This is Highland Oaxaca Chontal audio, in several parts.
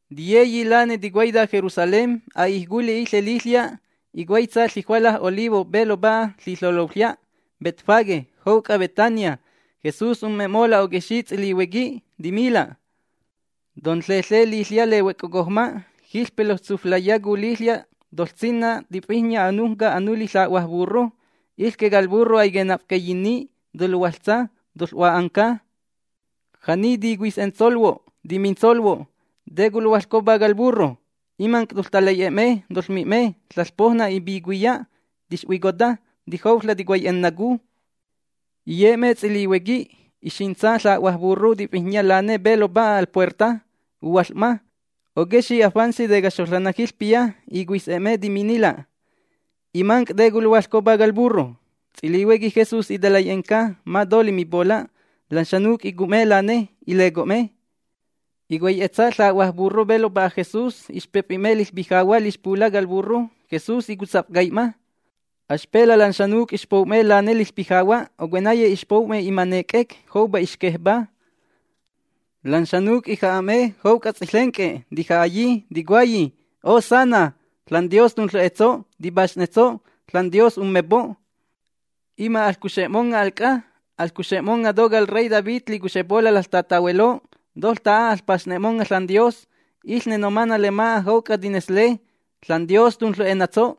Tiyeyi lane ticuaita Jerusalén. A'ij culi' iƚe liƚya'. Icuaitsa ƚijuala Olivo pe lopa'a ƚiƚeloƚya' Betfagé jouc'a Betania. Jesús umme'mola' oquexi' ts'ilihuequi, timila': ―Tonƚeƚe liƚya' lehuoc'ocojma. Jiƚpe loƚtsuflaiyacu liƚya' toƚsinna tifijnya anujnca anuli ƚa'hua burro. Iƚque cal burro aiquenafcaiyinni. Toluhuaƚtsa. Toƚ'hua'anca. Ja'ni ticuis'entsolhuo', timintsolhuo': “¿Te culuhuaƚcopa cal burro?”, imanc' toƚtalai'e'e'me, toƚmi'me: “ȽaƚPoujna ipicuiya tixhuicota. Tijouƚa' ticuai'enacu.” Iye'me ts'ilihuequi. Ixintsa ƚa'hua burro tifijnya lane pe lopa'a al puerta. Uhuaƚ'ma. Oquexi' afantsi tecaxoƚanna jiƚpiya icuis'e'me, timinnila': ―Imanc', ¿te culuhuaƚcopa cal burro? Ts'ilihuequi Jesús italai'enca ma to limipola'. Lan xanuc' icu'me lane, ileco'me. Icuai'etsa ƚa'hua burro pe lopa'a Jesús. Ixpefi'me liƚpijahua' lixpula' cal burro. Jesús icutsafcai'ma. Axpela' lan xanuc' ixpou'me lane liƚpijahua', ocuenaye ixpou'me imane' c'ec joupa ixquejpá. Lan xanuc' iƚej'me jouc'a ts'iƚenc'e tija'ayi, ticuayi: ―¡Hosana! ¡ȽanDios tunƚu'enatso', tipaxnetso'! ȽanDios ummepo'. ¡Ima' aƚcuxe'monga' al c'a! ¡Aƚcuxe'monga' to cal rey David licuxepola' laƚtatahueló! ¡Toƚta'a aƚpaxne'monga' ȽanDios! Iƚne nomana' lema'a jouc'a tinesle: “¡ȽanDios tunƚu'enatso'!”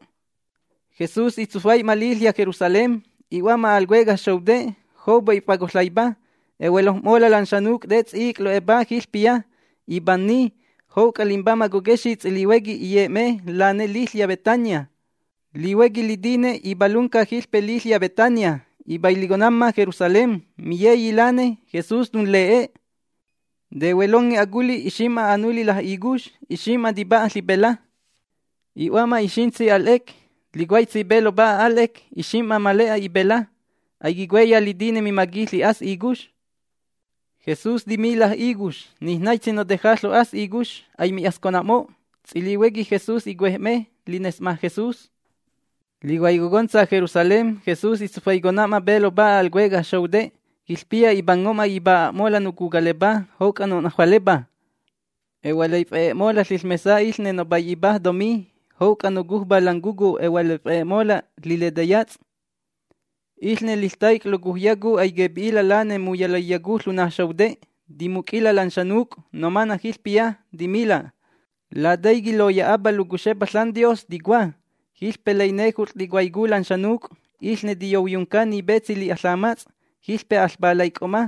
Jesús itsufai'ma liƚya' Jerusalén. I'hua'ma al cuecaj xoute'. Joupa if'acoƚaipa. Ehuelojm'mola' lan xanuc', te ts'i'ic' lo'epa jiƚpiya. Ipanni. Jouc'a limbamaj coquexi' ts'ilihuequi iye'me lane liƚya' Betania. Lihuequi litine ipalunca jiƚpe liƚya Betania ipailiconamma Jerusalén. Miyeyi lane Jesús tunle'e. Tehuelonge aculi' ixim'ma anuli la'icux. Ixim'ma tipa'a ƚipela. I'hua'ma ixintsi al 'ec. Licuaitsi pe lopa'a al 'ec ixim'ma le'a ipela. Aiquicuaiya litine mimaqui ƚi'as icux. Jesús timi la'icux: ―Nij naitsi noteja ƚo'as icux. Aimi'ascona'mo'. Ts'ilihuequi Jesús icuej'me lines'ma Jesús. Licuaicontsa Jerusalén Jesús itsufaicona'ma pe lopa'a al cuecaj xoute'. Jiƚpiya ipango'ma ipa'a'mola' nocucalepá jouc'a no'najualepá. Ejualaif'e'e'mola' liƚmesa iƚne nopai'ipaj tomí. Jouc'a nocujpá lan cucú ejualaif'e'e'mola' liletayats'. Iƚne liƚtaic' locujyacu aiquepi'ila' lane muyalaiyacu ƚuna xoute'. Timuc'ila' lan xanuc' nomana' jiƚpiya, timila': ―Lataiqui' loya'apa locuxepa ȽanDios ticua: “Jiƚpe lainejut'ƚ ticuaicu lan xanuc', iƚne tiyouyunca ni petsi li'a ƚamats', jiƚpe aƚpalaic'o'ma”.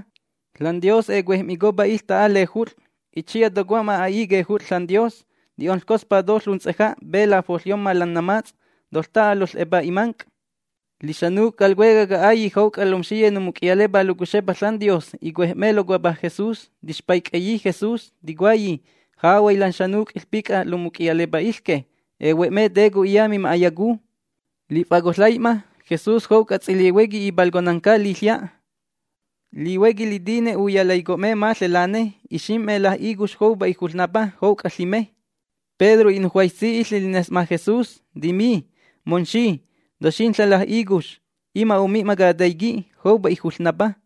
ȽanDios ecuej'micopa iƚta'a lejut'ƚ. Itsiya tocomma a'i quejut'ƚ ȽanDios. Ti'onƚcospa to ƚunts'eja' pe lafoƚyomma lan namats'. Toƚta'a lonƚ'epa imanc'. Lixanuc' cal cuecaj ca'ailli' jouc'a lomxiye nomuc'iyalepá locuxepa ȽanDios icuej'me locuapa Jesús. Tixpaic'eyi Jesús, ticuayi: ―Jahuay lan xanuc' iƚpic'a lomuc'iyalepa iƚque. Ehue'me te co'iya mima'ayacu. Lif'acoƚaijma Jesús jouc'a ts'ilihuequi ipalconanca liƚya'. Lihuequi litine uyalaicocona'me maƚe lane. Ixim'me la'icux joupa ijuƚnapa jouc'a ƚime. Pedro i'nujuaitsi lines'ma Jesús, timi: ―Momxi, ¡toxinƚa' la'icux! Ima' omi'ma cataiqui', joupa ijuƚnapa.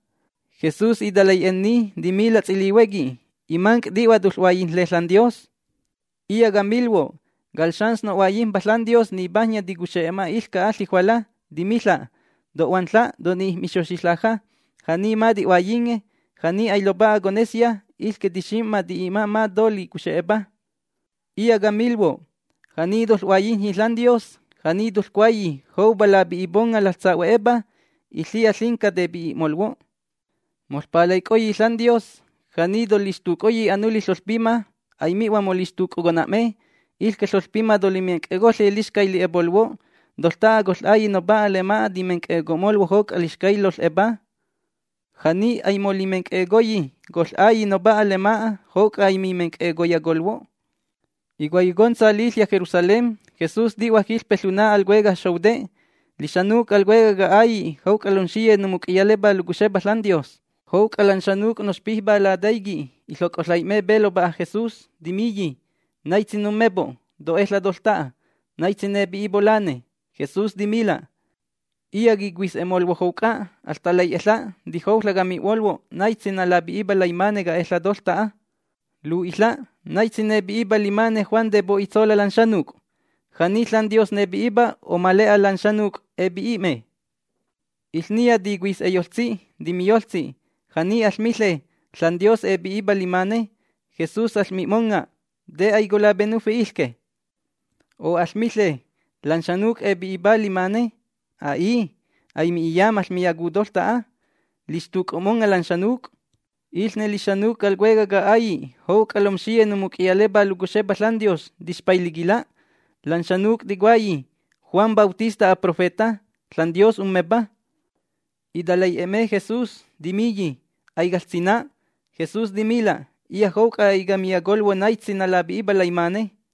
Jesús italai'enni, timila' ts'ilihuequi: ―Imanc', ti'hua toƚ'huaiyijnle ȽanDios. Iya' camilhuo': Cal xans no'huaiyijmpa ȽanDios nipajnya ticuxe'ma iƚca'a ƚijuala, timiƚa': “To'huaƚa', to'nij'mixoxi ƚaja”. Ja'ni ma ti'huaiyinge, ja'ni ailopa'a conesya, iƚque tixim'ma ti'i'ma ma to licuxe'epa. Iya' camilhuo': Ja'ni toƚ'huaiyijnyi ȽanDios, ja'ni toƚcuayi: “Joupa lapi'iponga' laƚsahue'epa”, iƚiya ƚinca tepi'i'molhuo'. ’Moƚpalaic'oyi ȽanDios, ja'ni tolixtuc'oyi anuli ƚoƚpima aimi'hua molixtuc'ocona'me. Iƚque ƚoƚpima tolimenc'e'ecoƚe lixcay li'e'epolhuo'. Toƚta'a coƚ'Ailli' Nopa'a lema'a timenc'e'eco'molhuo' jouc'a lixcay loƚ'epa. Ja'ni aimolimenc'e'ecoyi, coƚ'Ailli' Nopa'a lema'a jouc'a aimimenc'e'eyacolhuo'. Icuaiyocontsa liƚya' Jerusalén Jesús ti'hua jiƚpe ƚuna al cuecaj xoute'. Lixanuc' cal cuecaj ca'ailli', jouc'a lomxiye nomuc'iyalepá locuxepa ȽanDios, jouc'a lan xanuc' noxpijpá lataiqui', iƚoc'oƚai'me pe lopa'a Jesús, timiyi: ―¿Naitsi nummepo' to'eƚa' toƚta'a? ¿Naitsi nepi'ipo' lane? Jesús timila': ―Iya' quicuis'e'molhuo' jouc'a. Aƚtalai'eƚa'. Tijouƚa' cami'molhuo' naitsi nalapi'ipa laimane ca'eƚa' toƚta'a. Lu'iƚa': ¿Naitsi nepi'ipa limane Juan tepo'itsola' lan xanuc'? ¿Ja'ni ȽanDios nepi'ipa o ma le'a lan xanuc' epi'i'me? Iƚniya ticuis'eyoƚtsi, timiyoƚtsi: ―Ja'ni aƚmiƚe: “ȽanDios epi'ipa limane”, Jesús aƚmi'monga': “¿Te aicolapenufi iƚque?” O ¿aƚmiƚe: “Lan xanuc' epi'ipá limane”? A'i, aimi'iya maƚmiyacu toƚta'a. Lixtuc'o'monga' lan xanuc'. Iƚne lixanuc' cal cuecaj ca'ailli' jouc'a lomxiye nomuc'iyalepá locuxepa ȽanDios tixpailiquila'. Lan xanuc' ticuayi: “Juan Bautista aprofeta, ȽanDios ummepa”. Italai'e'e'me Jesús, timiyi: ―Aicaƚsina'. Jesús timila': ―Iya' jouc'a aicamiyacolhuo' naitsi nalapi'ipa laimane.